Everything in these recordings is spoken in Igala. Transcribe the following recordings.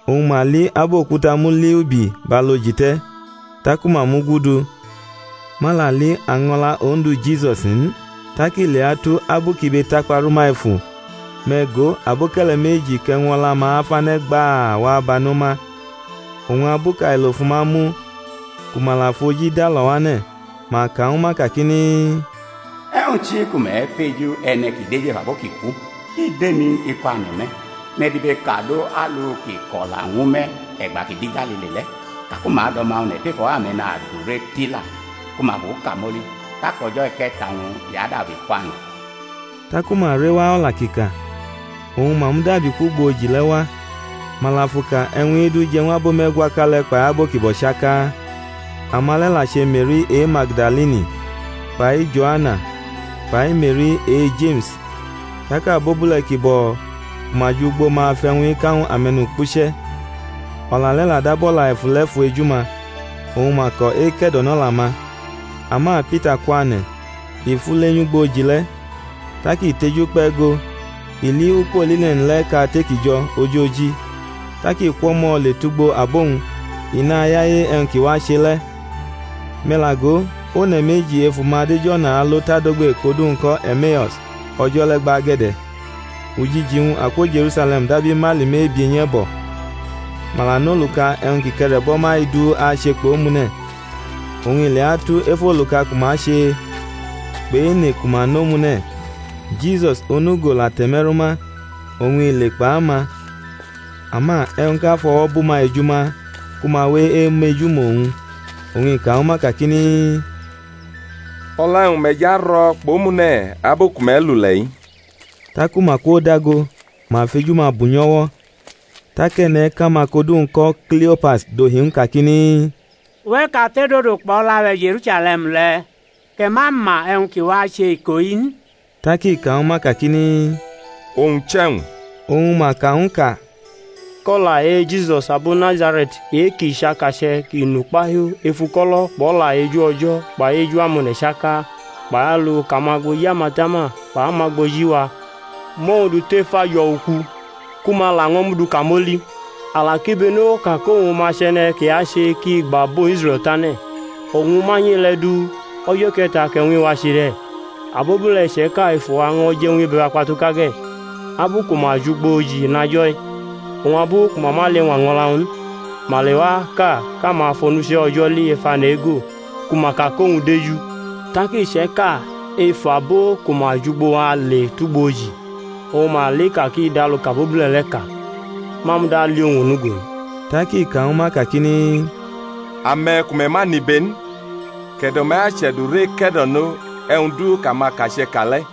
Oñ ma li abʼokuta muliubi bʼalu oji te̩. Taku mamugudu, ma la li año̩la Ondu Jisusi n. Tak i leatu, abu kʼibe takpa rʼuma efu, me̩ go, aboke̩le̩ meji, kʼe̩wñ o̩la-ma afane̩ gbaa, wa bano ma. Oñ abu kʼailo̩ fu ma mu, ku ma la fʼoji dalo̩ wʼane̩, ma ka ñwu ma kakini, E̩wñ chi ku me̩ feju e̩ne̩ ki deju ef abo ki ku? I dʼemi n, i kwane̩ me̩; me̩ dibekadʼalu kʼi ko̩la ñwu me̩ e̩gba kʼi de̩ Galili le̩, i ka ku ma adʼO̩ma One̩ tef o̩wo̩ ame̩nadure tila, ku ma fu kamoli, tak o̩jo̩ e̩ke̩ta-wñ i adabi kwane̩. Taku ma rewa o̩la kʼi ka, oñ ma mudabi kwʼugbo oji le̩ wa, ma la fʼuka e̩wñ-i du je̩ ñw abo me̩gwaka le̩ kpʼabo ki bo̩ chaka. Ama le̩ la che Me̩ri e-Magdalini kpai Jo̩ana kpai Me̩ri e-Jeme̩s; tak abobule̩ ki bo̩ ku ma jʼugbo ma fʼe̩wñ-i ka ñw ame̩nukpuche̩. O̩la le̩ la dab o̩la e̩fule̩fu eju-ma; oñ ma ko̩ eke̩do̩nʼo̩la-ma. [ Ama Pita kwane̩, i fule nyʼugbo oji le̩; tak i tejukpe̩ go, i li ukpo line̩n le̩ kate ki jo̩ ojoji; tak i kwʼo̩mo̩ le tʼugbo abo-wñ; i nayaye e̩wñ ki wache le̩.] Me̩ la go, one̩ meji ef uma dʼej o̩na alo tʼadogbe kʼodu-wñ ko̩ E̩meus o̩jo̩ le gbage̩de̩, ujiji-wñ akwo Je̩rusale̩m dab imaili mebie nyʼe̩bo̩. Ma la nʼoluka e̩wñ ki ke̩re̩bo̩ ma-i du ache kpʼomune̩. Oñ i leatu, ef oluka ku ma che, kpʼene ku ma nʼomune̩, Jisus, onugo, la te̩meru ma, oñ i le kpʼama. Ama e̩wñʼka fʼo̩wo̩ bʼuma eju ma ku ma we emejumʼowñ. Oñ i ka ñw ma kakini, O̩la e̩wñ me̩ jʼaro̩ kpʼomune̩ abu ku me̩ lule̩-i? Taku ma kwodago, ma fʼeju-ma bunyo̩wo̩. Tak e̩ne̩ʼka-ma kʼodu-wñ ko̩ Kliopas dohi ñw u kakini, Uwe̩ kate dodo kpʼo̩la-we̩ Je̩rusale̩m le̩, kʼe̩ ma ma e̩wñ ki wache iko-i n? Tak i ka ñw ma kakini, Owñ chʼe̩wñ? Oñ ma ka ñw u ka kʼo̩la e-Jisus abo Nazare̩t e-kʼi chʼakache̩ kʼi nʼukpahiu ef uko̩lo̩ kpʼo̩la eju O̩jo̩ kpai eju amone̩ chaka; kpai alu kʼamagboji amatama kpʼamagboji wa mʼowñ du tʼef ajo̩ uku, ku ma laño̩ mʼu du kamoli. A la kibeno ka kʼowñ ma chʼe̩ne̩ kʼi ache kʼi agba abo Israe̩l tane̩. Oñ amanyʼe-le̩ du, o̩jo̩ e̩ke̩ta kʼe̩wñ-i wache de̩. Abobule̩ iche̩ka ef uwa ño̩ je̩ ñw ibe-wa kpatuka ge̩, abu ku ma jʼugbo oji inajo̩-i; oñ abu ku ma ma li año̩la-wñ n, ma lewa ka kʼama fʼamonuche̩ O̩jo̩ li ef ane̩ ego ku ma ka kʼowñ deju. Tak iche̩ka ef abo ku ma jʼugbo wa le tugbo oji, oñ ma li ka kʼi dʼalu kʼabobule̩ le̩ ka; ma muda li owñ onugo n. Tak i ka ñwu ma kakini, Ame̩ ku me̩ ma nʼibe n, kʼe̩do̩-me̩ ache̩durʼeke̩do̩no e̩wñ du kʼamakache̩ ka le̩!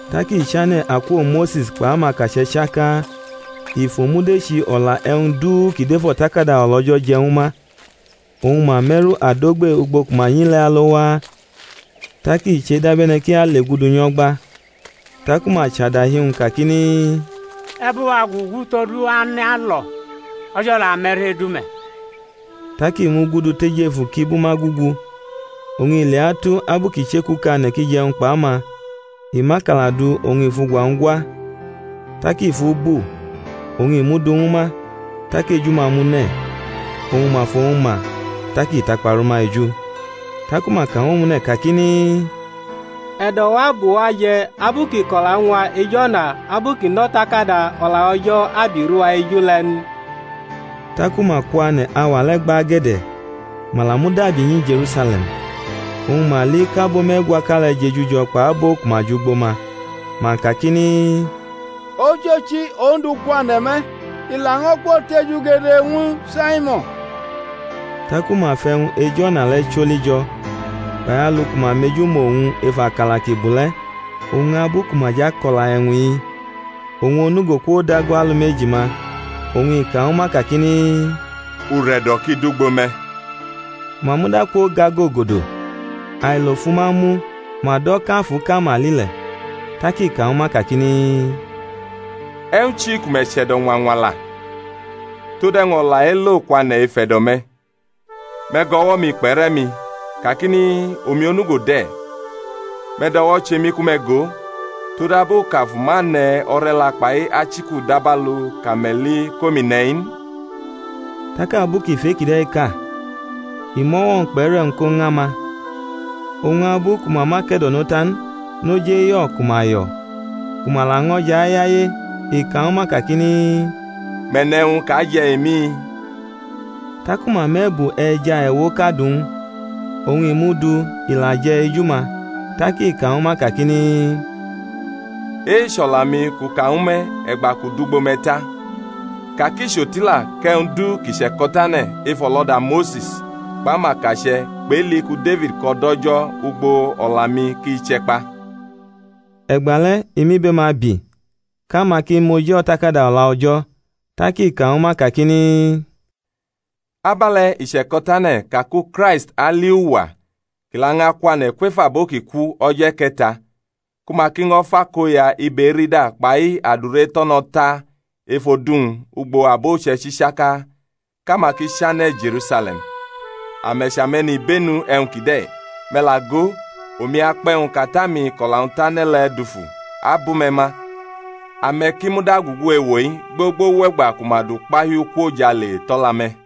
Tak i chane̩ akwo Mose̩s kpʼamakache̩ chaka, oñ i fʼomudechi o̩la e̩wñ-wñ du kʼi dʼef O̩takada O̩la O̩jo̩ je̩ ñwu ma. Oñ ma me̩ru adogbe ugbo ku ma nyi le̩ alo waa; tak i che dabe̩ne̩ kʼi ale gudu nyʼo̩gba. Taku ma chʼadahi-wñ kakini, E̩ bʼuwa gugu todu ane̩ alo̩, o̩jo̩ la me̩ru edu me̩. Tak i mugudu tʼejefu kʼi bʼuma gugu. Oñ i leatu, abu kʼi chekukane̩ kʼi jʼe̩wñ kpʼama, i mʼakala du oñ i fʼugwa-wñ gwa; tak i fu bu, oñ i mʼu du ñwu ma. Tak eju-ma mune̩, oñ ma fʼowñ ma; tak i takpa rʼuma eju. Taku ma ka ñw omune̩ kakini, E̩do̩-wa bʼuwa je̩ abu kʼi ko̩la ñw a ej o̩na abu kʼi nʼO̩takada O̩la O̩jo̩ abi rʼuwa eju le̩ n? Taku ma kwane̩ auwa le̩ gbage̩de̩, ma la mudabi nyi Je̩rusale̩m, oñ ma li kʼabo me̩gwaka le̩ jejujo kpʼabo ku ma jʼugbo ma, ma kakini, Ochochi, Ondu kwane̩ me̩, i laño̩ kwotejugede ñwu Saimo̩n. Taku ma fʼe̩wñ ej o̩na le̩ choli jo̩, kpai alu ku ma meju mʼowñ ef akala kʼi bu le̩. Oñ abu ku ma jʼako̩la e̩wñ-i, owñ onugo kwodago alumeji ma, oñ i ka ñwu ma kakini, Ure̩do̩ ki dʼugbo me̩. Ma muda kwogagogodo, ailo fʼuma mu, ma do̩ kʼafuʼka ma li le̩. Tak i ka ñwu ma kakini, E̩wñ chi ku me̩ chʼe̩do̩ ñwa ñwala? Tode̩wñ o̩la elo kwane̩ ef e̩do̩-me̩? Me̩ gʼo̩wo̩-mi kpʼe̩re̩-mi, kakini, Omi onugo de̩; me̩ dʼo̩wo̩ che mi ku me̩ go; todabu kʼafu ma ne̩ o̩re̩la kpai achiku dabalu kʼame̩ li kʼomi ne̩-i n. [ Tak abu kʼi fʼe-kide̩ ka, i mʼo̩wo̩-wñ kpʼe̩re̩-wñ ko ñama.] Oñ abu ku ma ma ke̩do̩no ta n, noj eyo̩ ku ma yo̩, ku ma laño̩ jo̩ ayaye, i ka ñwu ma kakini, Me̩ ne̩ e̩wñ kʼa je̩ emi? Taku ma mʼe̩bu e̩ja ewoʼka du ñw u. Oñ i mʼu du, i la je̩ eju-ma. Tak i ka ñwu ma kakini, E-i chʼo̩la-mi kʼu ka ñwu me̩ e̩gba kʼu dʼugbo me̩ ta, ka kʼi chʼotila kʼe̩wñ du ki che̩ko̩tane̩ ef o̩loda Mose̩s kpʼamakache̩ kpʼEli ku Defid ko̩ do̩ O̩jo̩ ugbo o̩la-mi, ki che̩ kpa. E̩gbale̩ i mʼibe-ma bi, kʼama ki moji O̩takada O̩la O̩jo̩. Tak i ka ñwu ma kakini, Abe̩le̩ i che̩ko̩tane̩ ka ku Kraist ali uwa kʼi lañʼakwane̩ kwef abo ki ku o̩jo̩ e̩ke̩ta; ku ma ki ño̩ fʼakoya ibe erida kpai adure eto̩no̩ ta ef odu-wñ ugbo abo uche̩ichi chaka, kʼama ki chane̩ Je̩rusale̩m. Ame̩ chʼame̩nibenu e̩wñ kide̩. Me̩ la go, omi akpʼe̩wñ kʼAta-mi kʼo̩la-wñ tane̩ le̩ dufu abʼume̩ ma: ame̩ ki muda gugu ewo-i, gbogbo wʼe̩gba ku ma dʼukpahiu kwo ojale tʼo̩la-me̩.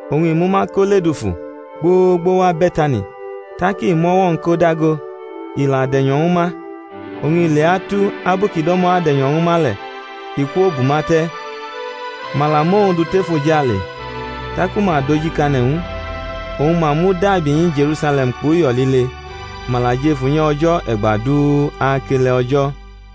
Oñ i mʼuma ko ledufu, gbogbo wa Be̩tani: tak i mʼo̩wo̩-wñ ko dago, i la de̩nyo̩ ñwu ma. Oñ i leatu, abu kʼi do̩mo̩ ade̩nyo̩ ñwu ma le̩, i kwobʼuma te̩, ma la mʼowñ du tʼefojale. Taku ma dojikane̩ ñw u, oñ ma mudabi nyi Je̩rusale̩m kpʼuyo̩ lile; ma la jʼef unyi O̩jo̩ e̩gba du akele O̩jo̩.